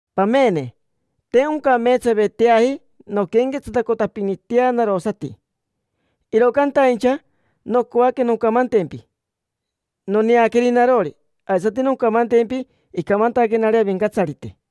Pamene, te oncameetsaveteaji nonquenquetsatacotapinitea narosati, iro cantaincha nocoaque noncamantempi noneaqueri narori. Aisati noncamantempi icamantaquenari Avincatsarite.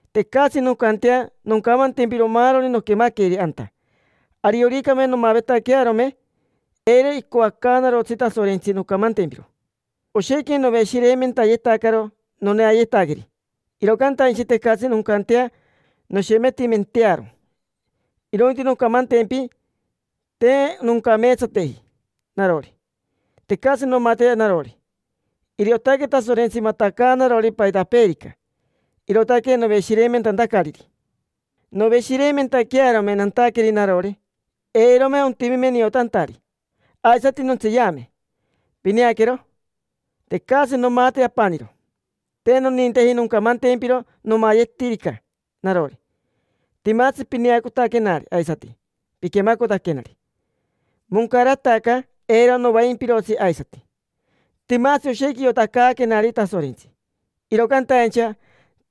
Tecatsi noncantea noncamantempiro maaroni noquemaqueri anta. Arioricame nomavetaquearome, eiro icoacaanarotsi Tasorentsi noncamantempiro. Oshequi noveshireimentayetacaro noneayetaqueri, iro cantaincha tecatsi noncantea noshemetimentearo. Irointi noncamantempi te noncameetsateji narori. Tecatsi nomate narori: iriotaque Tasorentsi matacaanarori paitapeerica, irootaque noveshireimentantacariri. Noveshireimentaquearome nantaqueri narori, eirome otimime niotantari. Aisati nontseeyame: pineaquero, tecatsi nomate apaniro. Te noninteji noncamantempiro nomayetirica narori. Timatsi pineacotaquenari aisati piquemacotaquenari: moncarataca, eiro novaimpirotsi aisati. Timatsi oshequi iotacaaquenari Tasorentsi, iro cantaincha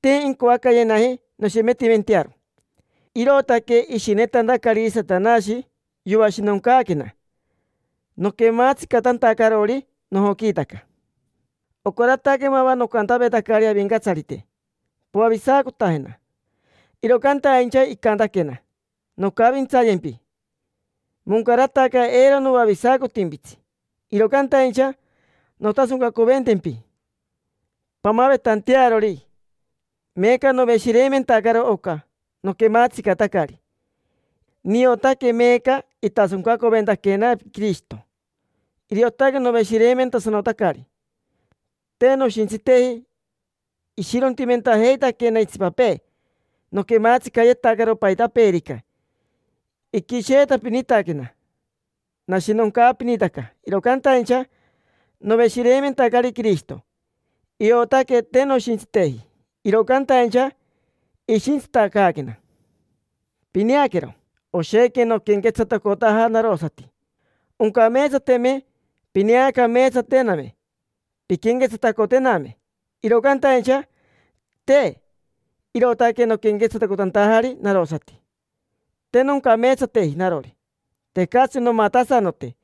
te incoacayenaji noshemetimentearo. Irootaque ishinetantacariri Satanashi yoashinoncaaquena, noquematsicatantacarori nojoquiitaca. Ocarataque mava nocantavetacari Avincatsarite: “Poavisacotajena”, iro cantaincha icantaquena: “Noncavintsayempi, moncarataca. Eiro noavisacotimpitsi, iro cantaincha nontasoncacoventempi pamavetantearori”. Meeca noveshireimentacaro oca noquematsicatacari: niotaque meeca itasoncacoventaquena Quirishito. Iriotaque noveshireimentasanotacari. Te noshintsiteji, ishirontimentajeitaquena itsipapee, noquematsicayetacaro paitapeerica, iquisheetapinitaquena, nashinoncaapinitaca, iro cantaincha noveshireimentacari Quirishito. Iotaque te noshintsiteji, iro cantaincha ishintsitacaaquena. Pineaquero, oshequi noquenquetsatacotaja narosati. Oncameetsateme pineacameetsatename, pinquenquetsatacotename, iro cantaincha, te. Irootaque noquenquetsatacotantajari narosati. Te noncameetsateji narori, tecatsi nomatasanote.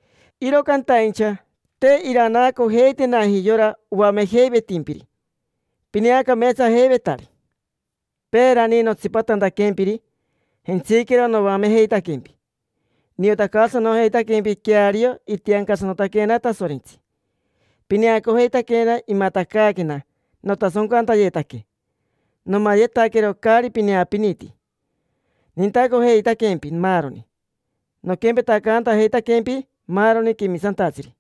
Iro cantaincha te iranaacojeitenaji yora oamejeivetimpiri pineacameetsajeivetari. Peerani, notsipatantaquempiri, jentsiquero noamejeitaquempi, niotacaasanojeitaquempi queario itiancasanotaquena Tasorentsi. Pineacojeitaquena imatacaaquena notasoncantayetaque, nomayetaquero caari pineapiniti. Nintacojeitaquempi, maaroni. Noquempetacaantajeitaquempi maaroni quemisantatsiri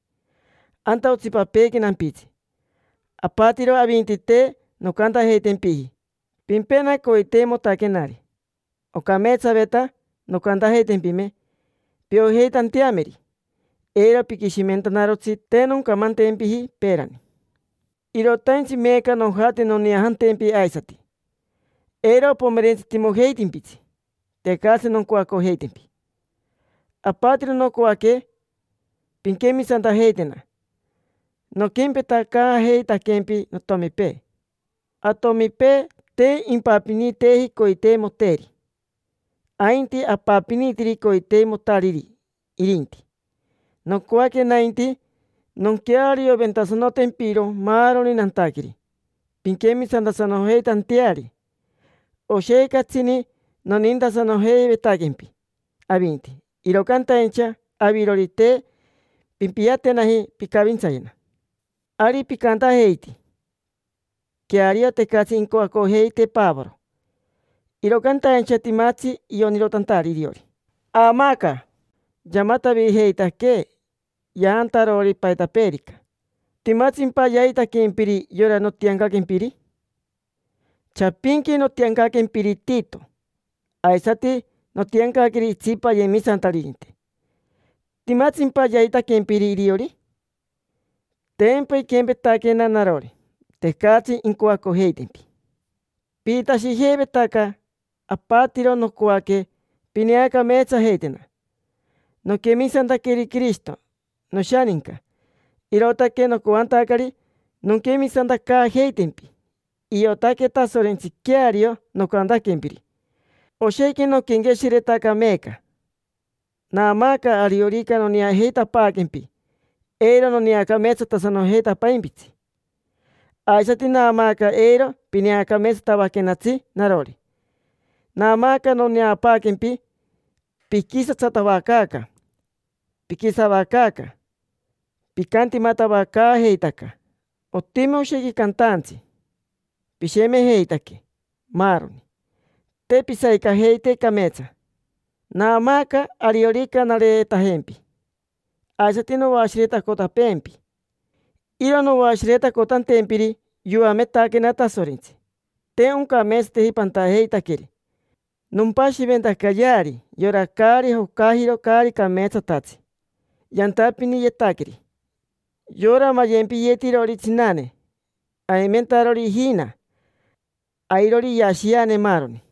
anta otsipapeequi nampitsi. Apatiro avinti, te noncantajeitempiji: “Pimpena coiteimotaquenari”. Ocameetsaveta noncantajeitempime piojeitanteameri. Eiro piquishimentanarotsi te noncamantempiji peerani. Irotaintsi meeca nojate noneajantempi aisati. Eiro opomerentsitimojeitimpitsi, tecatsi noncoacojeitempi. Apatiro nocoaque pinquemisantajeitena. Noquempetacaajeitaquempi notomipee. Atomipee te impapiniteeji coiteimoteeri, ainti apapinitiri coiteimotariri irinti. Nocoaque nainti nonquearioventasanotempiro maaroni nantaqueri pinquemisantasanojeitanteari. Oshequi catsini nonintasanojeivetaquempi avinti, iro cantaincha avirori, te pimpiatenaji pincavintsayena. Ari picantajeiti: “Queario, tecatsi incoacojeitee Pavoro, iro cantaincha timatsi ionirotantari iriori. Aamaaca yamatavijeitaquee, yaantarori paitapeerica”. ¿Timatsimpa yaitaquempiri yora notiancaquempiri? Chapinqui notiancaquempiri Tito aisati notiancaqueri itsipa ayemisantaririnte. ¿Timatsimpa yaitaquempiri iriori? Tempa iquempetaquena narori: tecatsi incoacojeitempi. Pijitashijeivetaca apatiro nocoaque pineacameetsajeitena. Noquemisantaqueri Quirishito, noshaninca, irootaque nocoantacari nonquemisantacaajeitempi. Iotaque Tasorentsi queario nocantaquempiri. Oshequi noquenqueshiretaca meeca. Naamaaca ariorica noneajeitapaaquempi eiro noneacameetsatasanojeitapaimpitsi. Aisati naamaaca eiro pineacameetsatavaquenatsi narori. Naamaaca noneapaaquempi piquisatsatavacaaca, piquisavacaaca, picantimatavacaajeitaca, otimi oshequi cantaantsi, pishemejeitaque, maaroni; te pisavicajeite cameetsa. Naamaaca ariorica nareetajempi aisati noashiretacotapeempi. Iro noashiretacotantempiri, yoametaquena Tasorentsi te oncameetsateji pantajeitaqueri. Nompashiventacayeari yora caari jocajiro caari cameetsatatsi yantapiniyetaqueri: yora mayempiyetirori tsinane, aimentarori ijina, airori iyashiane, maaroni.